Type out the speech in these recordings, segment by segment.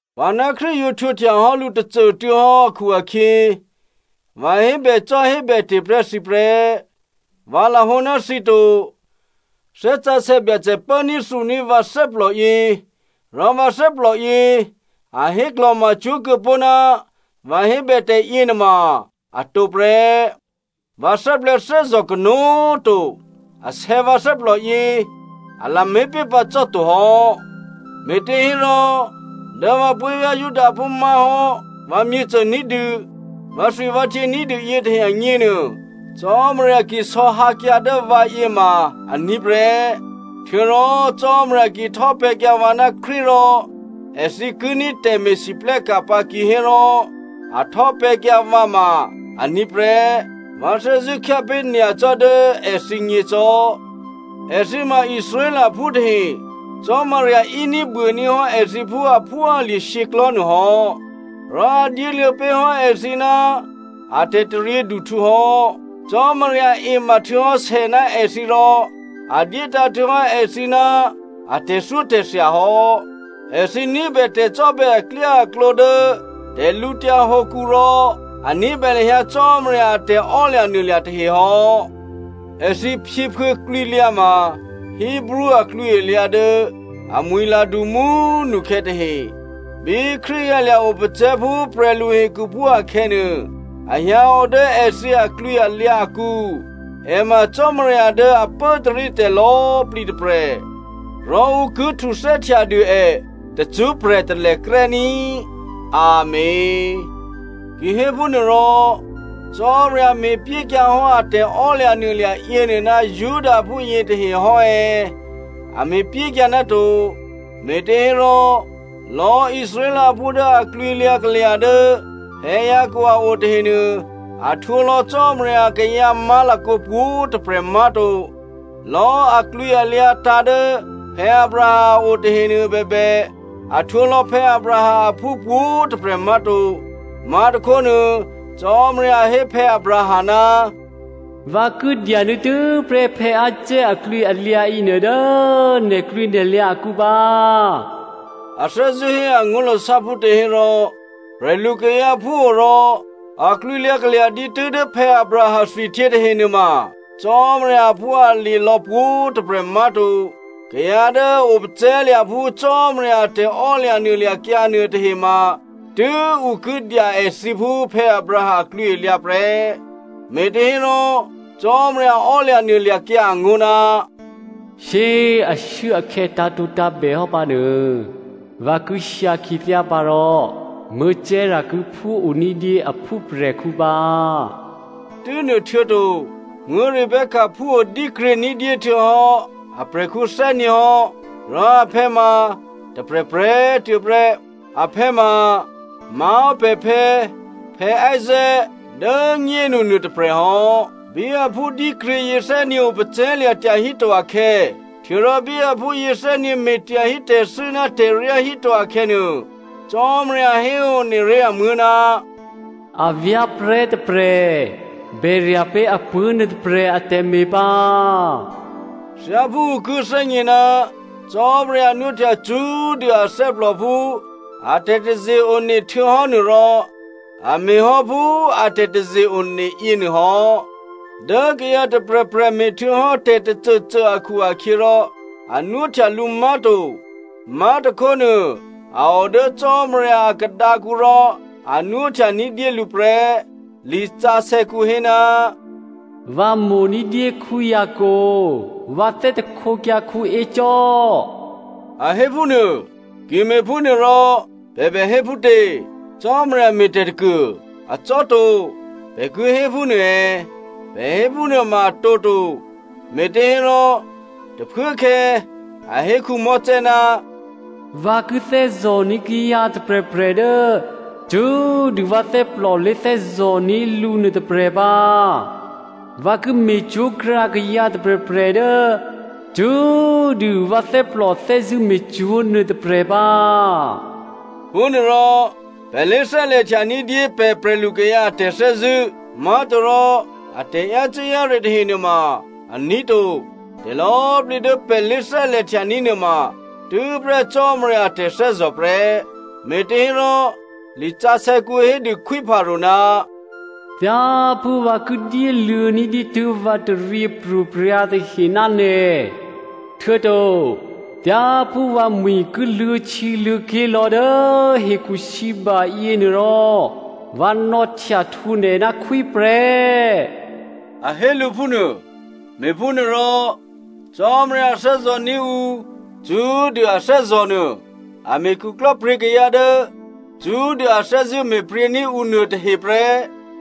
Vǎ ná Krístu yǒ htwǒhtya hò́ lǔ tôcô꤮ tuô̌ hò́ akhu-akhyě, vǎ hébècò́hébète̤ prè́ thǐ prè́. Vǎ lahǒ ná thǐ to. Thè́ Sǎsè̌ Byacè pốní̤ thǔní̤ vǎ thè́plòyě, rò vǎ thè́plòyě a héklò̤macwó̤ kuô̌pó̤ ná vǎ hébè tè̤yěnuôma atǒ prè́. Vǎ thè́plè̤̌thè́zò̤ kanó̤꤮ to. Asè̌ vǎ thè́plòyě, a lamé̤ pé̤pǎ cò́to hò́. Me̤těhérò, dố vǎ puố̤vyá̤ Judaphú, má̤hò́ vǎmyěcô ní̤dû, vǎthwivǎhtyě ní̤dû yětahe agněnuô, Cò́marya ki isò̌hǎkyǎ dố vǎyě ma aní̤ prè́, htuô̌rò Cò́marya ki htò́pè̤̌kyǎ vǎ ná Krístu rò èthǐ ki ní̤ tè̤me̤lwóhteka̤ pǎ kihérò a htò́pè̤̌kyǎ vǎ ma aní̤ prè́, vǎ thè́zṳ̂́ khyápé̤ nyacò́ dố èthǐgně cò́. Èthǐ ma Israelphú tahe. Cò́marya íní̤buôní̤ hò́ èthǐ phú aphúalye̤ shyěklò̤́ nuôhò́. Rò a dyéluô̌ pé̤ hò́ èthǐ ná a tè̤taryěduhtǔ hò́. Cò́marya ema htuô̌hò́ sè ná èthǐ rò a dyétǎ̤ htuô̌hò́ èthǐ ná a tè̤thyótè̤thya hò́. Èthǐ ní̤bè tè̤cò́bè̌ aklyáaklǒ dố tè̤lǔtyǎ hǒkǔ rò a ní̤bè lahyǎ Cò́marya a tè̤emaklò̤ tahe hò́. Èthǐ phyěphuô̌ klwǐlyǎ ma Hebreo aklwǐalyǎ dố amwi̤la du mú꤮ nukhè̌ tahe. Bí Krístu hyǎlya̤ opacè̤̌ phú prè̤lu hekhuphú akhè̌nuô, a hyǎo dố èthǐ aklwǐalyǎ akǔ. È ma Cò́marya dố a pốtarítè̤ lò̌꤮ plǐ tôprè̤, rò ǔ ki htuthè́htyadû è tacṳ́prè̤ talèkrè́ ní꤮. Amèn. Kihéphúnuôrò, Cò́marya me̤pyékyǎhò́ a tè̤emaklò̤ yěnuô ná Judaphú yětahe hò́ è̌? A me̤pyékyǎ ná to. Me̤těhérò lò̌꤮ Israelphú dố aklwǐlyǎ kalya̤ dố Jacob a o tahenuô, a htwǒlò̌ Cò́marya kayǎ má̤lakǒ pwǒ̤꤮ tôprè̤ má̤to. Lò̌꤮ aklwǐalyǎ tǎ̤ dố Abraham a o tahenuô bèbè, a htwǒ lò̌ Abraham aphú pwǒ̤꤮ tôprè̤ má̤to. Má̤tôkhónuô, Cò́marya hé Abraham, “Vǎ ki dyanuô̌ tû́prè́ Isaac aklwǐalyǎ yěnuô dố nè̤klwǐnè̤lyǎ akǔ pǎ.” A thè́zṳ̂́ hé angó̤lasá phútě hérò, prè̤lukayǎ phúo rò aklwǐlyǎ kalya̤ dǐtû́ dố Abraham thwihtyě tahenuôma, Cò́marya aphúalye̤ lò̌ pwǒ̤꤮ tôprè̤ má̤to. Kayǎ dố a opacè̤̌lya̤ phú Cò́marya a tè̤ò́lya̤nuôlya̤kyǎ nuôtahema tû́ ǔ ki dya èthǐ phú Abraham aklwǐalyǎ prè́. Me̤těhérò, Cò́marya ò́lya̤ nuôlya̤kyǎ angó̤, “Shyé꤮ ashuốakhè̌ tǎ̤tǒtǎ̤bèhò́ pǎnuô, vǎ ki hyǎ khyěthyá pǎ rò Sara ki phúoní̤dyé a phúprè̤khǔ pǎ.” Tû́nuôhtuô̌to, Rebecca phúo dǐkryě ní̤dyé htuô̌hò́ aprè̤khǔ thè́nyě̤ hò́, rò aphè̌ ma tôprè̤prè̤꤮ tuô̌ prè́. Aphè̌ ma má̤hò́ pè̤phè̌ Isaac dố꤮ nyénu nuôtôprè̤ hò́. Bí aphú dǐkryě yěthè́nyě̤ opacè̤̌lya̤ tyahíto akhè̌, htuô̌rò bí aphú yěthè́nyě̤ me̤ tyahí tè̤thû́ ná tè̤ryá híto akhè̌nuô, Cò́marya héone ré̤ amuố̤, “Avyá̤prè̤́ tôprè̤ bèrya̤ pé̤ apuố̤ nuôtôprè̤ atè̤me̤ pǎ.” Thyáphú ǔ ki thè́gně ná Cò́marya nwóhtya cṳ́꤮ dû athè́plò phú a tè̤taze-one htuô̌hò́ nuôrò, a me̤hò́ phú a tè̤taze-one yěnuô hò́. Dố kayǎ tôprè̤prè̤ me̤htuô̌hò́ tè̤tôcôcô akhu-akhyěrò a nwóhtya lǔ má̤to. Má̤tôkhónuô, a o dố Cò́marya a khadǎkǔ rò a nwóhtya ní̤dyé lǔ prè́. Lisǎsè̌kǔ hé, “Vǎ mo̤ ní̤dyé Jacob, vǎ thè́htekyǎ Esau,” a héphúnuô. Ki me̤phúnuôrò pè̤ bè hé phútě? Cò́marya me̤ tè̤ tôkuô, acò́to, pè̤ ki hé phúnuô è̌? Pè̤ hé phúnuô ma atǒ to. Me̤těhérò, tôphuốkhè̌ a hé Mosè, “Vǎ ki thè́zò̤ní̤ kayǎ tôprè̤prè̤ dố cṳ́꤮ dû vǎ thè́plò lé̤thè́zò̤ní̤ lǔ nuôtôprè̤ pǎ. Vǎ ki me̤cwó̤krǎ kayǎ tôprè̤prè̤ dố cṳ́꤮ dû vǎ thè́plò thè́zṳ̂́ me̤cwó̤ nuôtôprè̤ pǎ.” Phúnuôrò pè̤ lé̤thè́lè̤htya ní̤dyé pè̤ prè̤lukayǎ a tè̤thè́zṳ̂́, má̤torò, atè̤ yácû́-yáre tahe nuôma aní̤ to. Tè̤lò̌꤮ plǐ dố pè̤ lé̤thè́lè̤ htyaní̤ nuôma tû́prè́ Cò́marya a tè̤thè́zò̤ prè́. Me̤těhérò lisǎsè̌kǔ hédû Khwí Pharao, “Thyáphú vǎ ki dyéluô̌ ní̤ dǐtû́ vǎ taryěpro̤prya̤ tahe ná nè̤, htuô̌to thyáphú vǎmwi̤ ki luô̌htyěluô̌ké̤ lò̌ dố hekhusǐba yěnuôrò, vǎ nò̌htyahtwǒ nè̤ ná khwí prè́,” a hé lǔ phúnuô. Me̤phúnuôrò Cò́marya thè́zò̤ní̤ ǔ cṳ́꤮ dû a thè́zò̤ nuô, a me̤ khuklò́pryě̤ kayǎ dố cṳ́꤮ dû a thè́zṳ̂́ me̤pryě̤ní̤ ǔ nuôtahe prè́.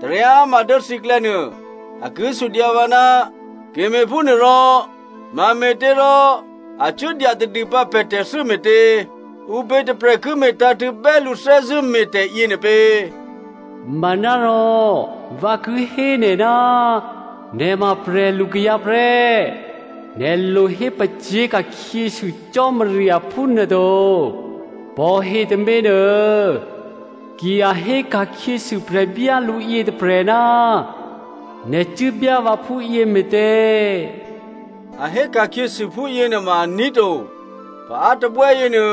Taryáma dố thǐklè̌nuô, a ki sudyǎ vǎ, “Ki me̤phúnuôrò mame̤těrò a cuố dyatadûpǎ pè̤ tè̤thû́ me̤tě? Ǔpě tôprè̤ ki me̤tǎ̤tṳ̂̌ bè́ lǔ thè́zṳ̂́me̤tè̤ yěnuô pě?” Manárò vǎ ki hé nè̤, nè̤ ma prè̤lu kayǎ prè́. Nè̤ lohé pacyé̤ ka̤khyěsû Cò́marya phúnuôto. Pò̤he tôměnuô, ki a hé ka̤khyěsû prè̤byálǔ yětôprè̤, “Nè̤ cuốbyá vǎ phúyě me̤tě?” A hé ka̤khyěsû phúyě nuôma aní̤ to. Paá tôbè́ yěnuô,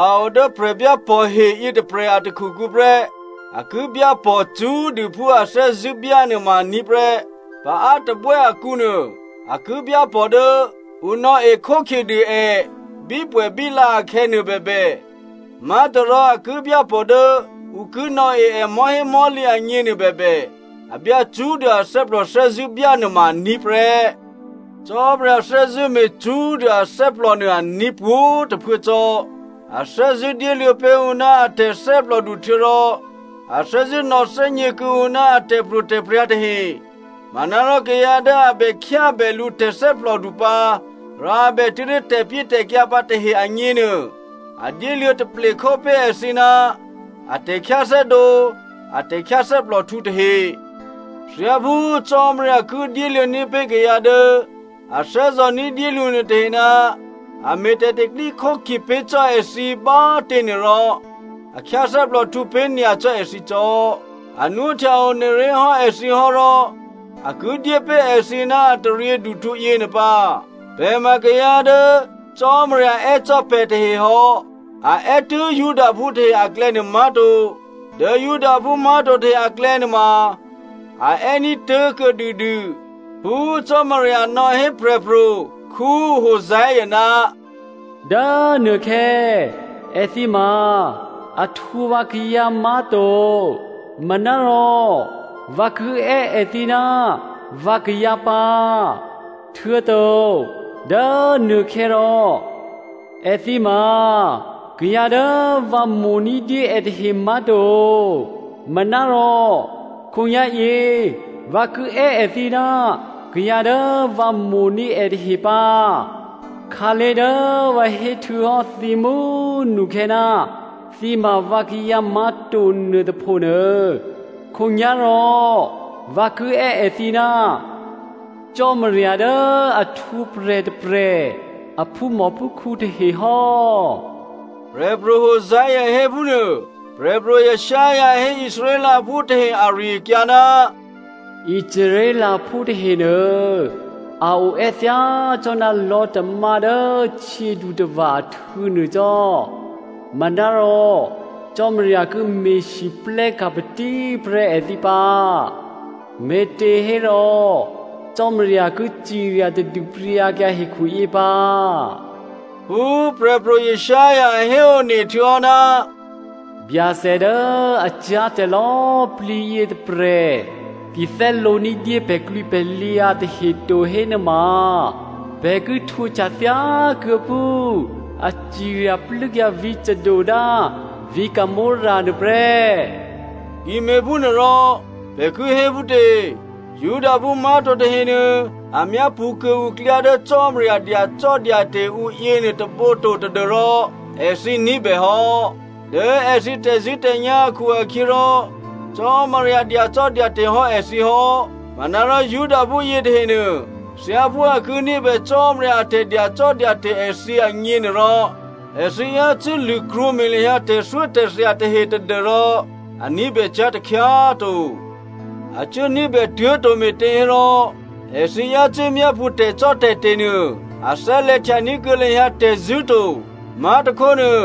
a o dố prè̤byápò̤he yětôprè̤ a takhukǔ prè́, a ki byápò̤ cṳ́꤮ dû phú a thè́zṳ̂́ byánuô ma aní̤ prè́. Paá tôbè́ akǔnuô, a ki byápò̤ dố ǔ nò̌e khókhyedû è bípwè̌bíla akhè̌ nuôbèbè, má̤torò a ki byápò̤ dố ǔ ki nò̌e è mò̤́hémò̤́lǐ agně nuôbèbè, a byá cṳ́꤮ dû athè́plò thè́zṳ̂́ byá nuôma aní̤ prè́. Cò́marya thè́zṳ̂́ me̤ cṳ́꤮ dû athè́plò nuô, aní̤ pwǒ̤꤮ tôphuố cò́. A thè́zṳ̂́ dyéluô̌ pé̤ ǔ ná a tè̤thè́plòdu htuô̌rò a thè́zṳ̂́ nò̌thè́gně kuô̌ǔ ná a tè̤pro̤tè̤prya̤ tahe. Manárò kayǎ dố a bè khyábè lǔ tè̤thè́plòdu pǎ, rò a bè tuố̤dố tè̤pyétè̤kyǎ pǎ tahe agněnuô, a dyéluô̌ taple khópé̤ èthǐ ná a tè̤khyáthè́dǒ, a tè̤khyáthè́plòhtǔ tahe. Thyáphú Cò́marya ki dyéluô̌ní̤ pé̤ kayǎ dố a thè́zò̤ ní̤dyé lǔ nuôtahe ná a me̤ tè̤pro̤tè̤prya̤ pé̤ cò́ èthǐ bá꤮ těnuô rò, a khyáthè́plòhtǔ pé̤ nyacò́ èthǐ cò́. A nwóhtya one ré̤ hò́ èthǐ hò́rò a ki dyé pé̤ èthǐ ná a taryěduhtǔ yěnuô pǎ. Pè̤ ma kayǎ dố Cò́marya è́ cò́ pè̤ tahe hò́. A è́ tû́ Judaphú tahe aklè̌nuô má̤to, dố Judaphú má̤to tahe aklè̌nuôma, a è́ ní̤ tố̤kuô̌ dûdû. Phú Cò́marya nò̌hé prè̤pro̤ Hosea, “Dố nuôkhè̌ èthǐ ma a htwǒ vǎkayǎ má̤to, manárò vǎ ki è́ èthǐ, ‘vǎkayǎ’ pǎ, htuô̌to, dố nuôkhè̌ rò èthǐ ma kayǎ dố vǎ mo̤ ní̤dyé è tahe má̤to manárò khǒnyá̤yě vǎ ki è́ èthǐ, ‘Kayǎ dố vǎ mo̤ní̤ è tahe’ pǎ.” “Khǎlé̤ dố vǎ héhtuô̌hò́ thǐ mú꤮ nukhè̌, ‘Thǐ ma vǎkayǎ má̤to’ nuôtôpho nuô, khǒnyá̤rò vǎ ki è́ èthǐ ná ‘Cò́marya dố a htwǒprè̤ tôprè̤ a phúmòphúkhǔ tahe’ hò́,” prè̤pro̤ Hosea hé phúnuô. Prè̤pro̤ Isaiah hé Israelphú tahe ari-akyǎ, “Israelphú tahenuô, a oè́ thyácò́ná lò̤́tamá dố htyědutava̤ ahtû̌ nuô cò́ manárò Cò́marya ki me̤lwóhteka̤ patíprè́ èthǐ pǎ. Me̤těhérò, Cò́marya ki cirya tadû pryǎkyǎ hekhuyě pǎ.” Phú Prè̤pro̤ Isaiah héone htuô̌hò́, “Byacè dố a cyá̤tè̤ lò̌꤮ plǐ yětôprè̤ ki thè́lǒní̤dyé pè̤klwǐpè̤lyǎ tahe to hénuôma, pè̤ ki htwǒhtya thyákuô̌ phú a cirya plû́kyǎ vǐ̤ Sodom ná vǐ̤ Gomorra nuô prè́.” Ki me̤phúnuôrò, pè̤ ki hé phútě? Judaphú má̤to tahenuô, a myápṳ̌ kuô̌ǔ klyá dố Cò́marya dyacò́dyate̤ ǔ yěnuôtôbǒ to tadû́rò èthǐ ní̤bè hò́. Dố èthǐ tè̤zṳ̂́tè̤nyá̤ akhu-akhyěrò Cò́marya dyacò́dyate̤ hò́ èthǐ hò́. Manárò Judaphú yětahenuô, thyáphú a ki ní̤bè Cò́marya a tè̤dyacò́dyate̤ èthǐ agněnuôrò, èthǐ yácû́ lṳ̂krwǒme̤ lahyǎ tè̤thyótè̤thya tahe tadû́rò a ní̤bè cyá̤ takhyá꤮ to. A cuố ní̤bè tuố̤ to me̤těhérò èthǐ yácû́ myápṳ̌ tè̤cò́tè̤te̤ nuô, a thè́lè̤htyaní̤ kuô̌ lahyǎ tè̤zṳ̂́ to. Má̤tôkhónuô,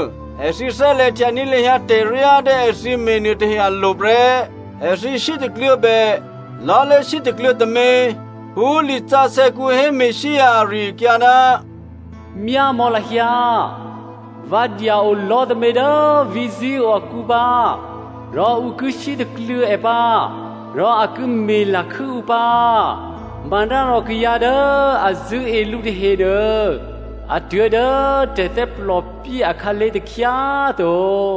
èthǐ thè́lè̤htyaní̤ lahyǎ tè̤ryá dố èthǐ me̤ nuôtahe alo̤ prè́. Èthǐ sítakluô̌bè “Lò̤́ lé̤sítakluô̌ tômě.” Phú lisǎsè̌kǔ hé Messia ari-akyǎ, “Myámò̌ lahyǎ, vǎ dya-o lò̤́ tômě dố vǐ̤ Zion akǔ pǎ, rò ǔ ki sítakluô̌ è pǎ, rò a ki me̤lakhû́ ǔ pǎ. Manárò kayǎ dố a zṳ̂́e lǔ tahenuô, a tuố̤ dố tè̤thè́plòpyé akhǎlé̤ takhyá꤮ to.”